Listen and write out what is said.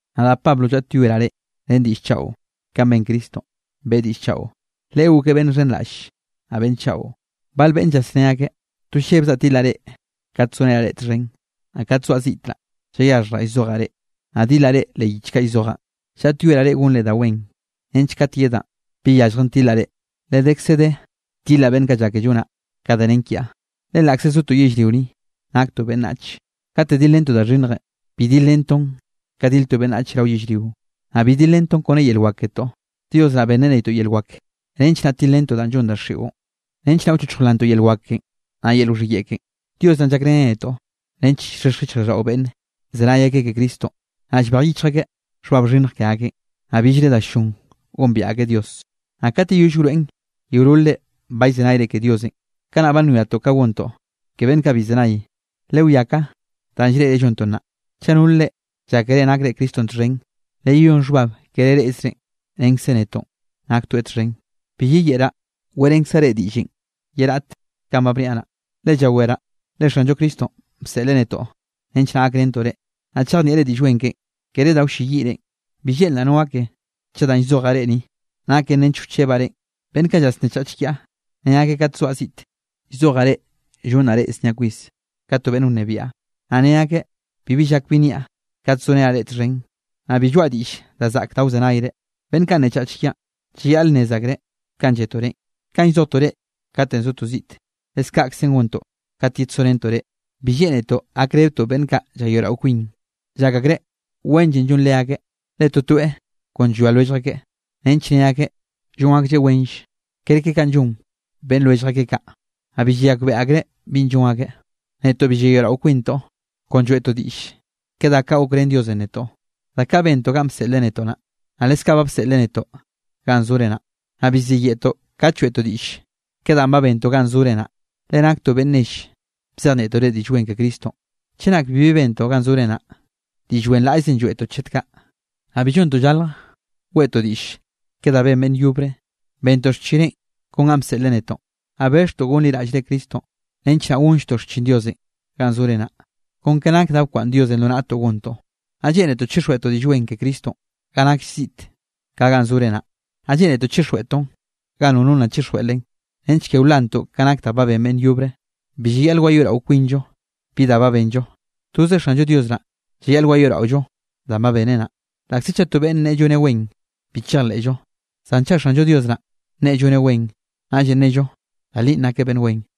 Nadaꞌ Pablo llaꞌtyoeraꞌ reꞌ ren diꞌll chaꞌo, kanꞌ ben Cristonꞌ, beꞌe diꞌll chaꞌo, Leꞌe gokeꞌ beꞌnn xhenraꞌll, naꞌ beꞌnn chaꞌo. Bal beꞌnne llasné akeꞌ, to llebzaꞌ tilaꞌ reꞌ kat zorenaꞌ reꞌ txhen, naꞌ kat zoaꞌ ziꞌte naꞌ, llayaxhjraꞌ llzojaꞌ reꞌ, naꞌ dilaꞌ reꞌ leꞌ yich kaꞌ llzojaꞌn. Llaꞌtyoeraꞌ reꞌ gonre da wen nench kat yedaꞌn, bi yalljen tilaꞌ reꞌ, le dekze de tilaꞌ beꞌnn kaꞌ llake llonaꞌ ka danꞌ nen kiaꞌ. Le laꞌkze zotoꞌ yellrio ni, naktoꞌ beꞌnnach, kate dilrentoꞌ da xhinnjenꞌ, bi dilrentoꞌn ka dil to beꞌnnach rao yellrio. Naꞌ bi dilrentoꞌn kone yel wak ketoꞌ. Dios naꞌ benneꞌ netoꞌ yel wak, nench naꞌ tilrentoꞌ danꞌ llon daxiꞌon, nench naꞌ wchochj wlantoꞌ yel wak ken, naꞌ yel wxhiyeꞌe ken. Dios naꞌn llakrén netoꞌ nench llxhexj yichjraꞌlldaꞌo beꞌnne, llzenay akeꞌ ke Cristonꞌ, naꞌ llbej yichj akeꞌ xhbab xhinnj ke akeꞌn, naꞌ billre da ll-llon gombiaꞌ akeꞌ Dios. Naꞌ kat yeyoll wroeꞌn yeololre ba llzenayre ke Diosenꞌ, kanaꞌ ba nwiatoꞌ ka gontoꞌ ke beꞌnn kaꞌ bi llzenay. Lewiá ka danꞌ llreꞌre llontoꞌ naꞌ. Chaꞌ nol reꞌ llákere nakre Cristonꞌ txhen, leyeyón xhbab kere reꞌzreꞌn, renkze netoꞌn naktoeꞌ txhen. Bi yeyeꞌraꞌ, weꞌrenkzaꞌ reꞌ diꞌllenꞌ ye raꞌte kanꞌ ba biaꞌn naꞌ, le llaweraꞌ le Xanllo Cristonꞌ, bseꞌl netoꞌ nench naꞌ gakrentoꞌ reꞌ, naꞌ chejnieꞌre Diꞌll Wen keꞌen, kere da wlleyiꞌ reꞌn. Bi lleꞌnraꞌ no gake chaꞌ danꞌ llzojaꞌ reꞌ ni, naken nench wchebaꞌ reꞌn. Beꞌnn kaꞌ llasnnechach kiaꞌ, ne akeꞌ kat zoaꞌ ziꞌte, llzojaꞌ reꞌ llonraꞌ reꞌ znia kwis ka to beꞌnn wnebiaꞌ; naꞌ ne akeꞌ bibi llak bi nniaꞌ, kate zorenaꞌ reꞌ txhen, naꞌ bi lloaꞌa diꞌll da zaꞌk da wzenayre. Beꞌnn kaꞌ nnechach kiaꞌn, llayaꞌl nnez akreꞌ kanꞌ lletoꞌ reꞌn, kanꞌ llzojtoꞌ reꞌ katenꞌ zotoꞌ ziꞌte, leskaꞌkze gontoꞌ kat yedsorentoꞌ reꞌ. Bi lleꞌnetoꞌ gakrebetoꞌ beꞌnn kaꞌ llayoeꞌrao kwin. Llak akreꞌ wenllenꞌ llon leakeꞌ, le totoeꞌ kon llwia lwellj akeꞌ, nench nne akeꞌ llon aklleꞌ wenll kerke kanꞌ llon beꞌnn lwellj akeꞌ kaꞌ, naꞌ bi llayakbeꞌe akreꞌ binꞌ llon akeꞌ. Netoꞌ bi llayoeꞌrao kwintoꞌ, kon lloeꞌtoꞌ diꞌll ke da kaꞌ gokrén Diosenꞌ netoꞌ, da kaꞌ bentoꞌ ganꞌ bseꞌleꞌ netoꞌ naꞌ, naꞌ leskaꞌ ba bseꞌleꞌ netoꞌ ganꞌ zore naꞌ. Naꞌ bi ziyeꞌtoꞌ kat lloeꞌtoꞌ diꞌll ke danꞌ ba bentoꞌ ganꞌ zore naꞌ, le naktoꞌ beꞌnn nell bzejnieꞌtoꞌ reꞌ Diꞌll Wen ke Cristonꞌ. Chenak bibi bentoꞌ ganꞌ zore naꞌ, diꞌll wenraꞌllzenꞌ lloeꞌtoꞌ chet kaꞌ. Naꞌ bi llontoꞌ llalj weꞌtoꞌ diꞌll ke da ben beꞌnn yobre, bentoꞌ xchineꞌ kon ganꞌ bseꞌleꞌ netoꞌn. Nna bexhtoꞌ gonliraꞌll-llre Cristonꞌ nench naꞌ gonlltoꞌ xchin Diosenꞌ ganꞌ zore naꞌ, kon ke nak da bkwaꞌnn Diosenꞌ lo naꞌtoꞌ gontoꞌ. Naꞌ lleꞌnetoꞌ chixjweꞌtoꞌ Diꞌll Wen ke Cristonꞌ ga nakll ziꞌt ka ganꞌ zore naꞌ. Naꞌ lleꞌnetoꞌ chixjweꞌtoꞌn ga nono nna chixjweꞌ len, nench ke wlantoꞌ ka nak da ba ben beꞌnn yobre. Bi llayaꞌl wayoeꞌrao kwinllo bi da ba benllo, toze Xanllo Dios naꞌn llayaꞌl wayoeꞌraollo danꞌ ba beneꞌ naꞌ. Laꞌkze chaꞌ to beꞌnn nneꞌe lloneꞌ wen, bi chejleꞌllo. Zan chaꞌ Xanllo Dios naꞌ, nneꞌe lloneꞌ wen, naꞌllenꞌ nnello da linꞌ nakeꞌ beꞌnn wen.